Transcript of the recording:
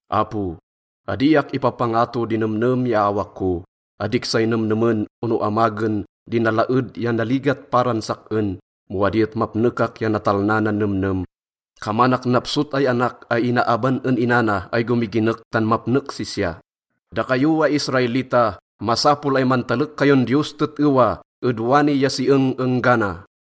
Apo, adiak ipapangato di nemnem ya awak ko. Adik say nemnemen ono amagen di nalaed ya naligat paran sak-en, mo adi et mapnekak ya natalna nan nemnem. Kamanak napsot ay anak ay inaaban en ina na ay gomiginek tan mapnek sisya. Dakayo ay Israelita, masapol ay mantalek kayon Diyos tet-ewa ed wani ya si eng-enggana.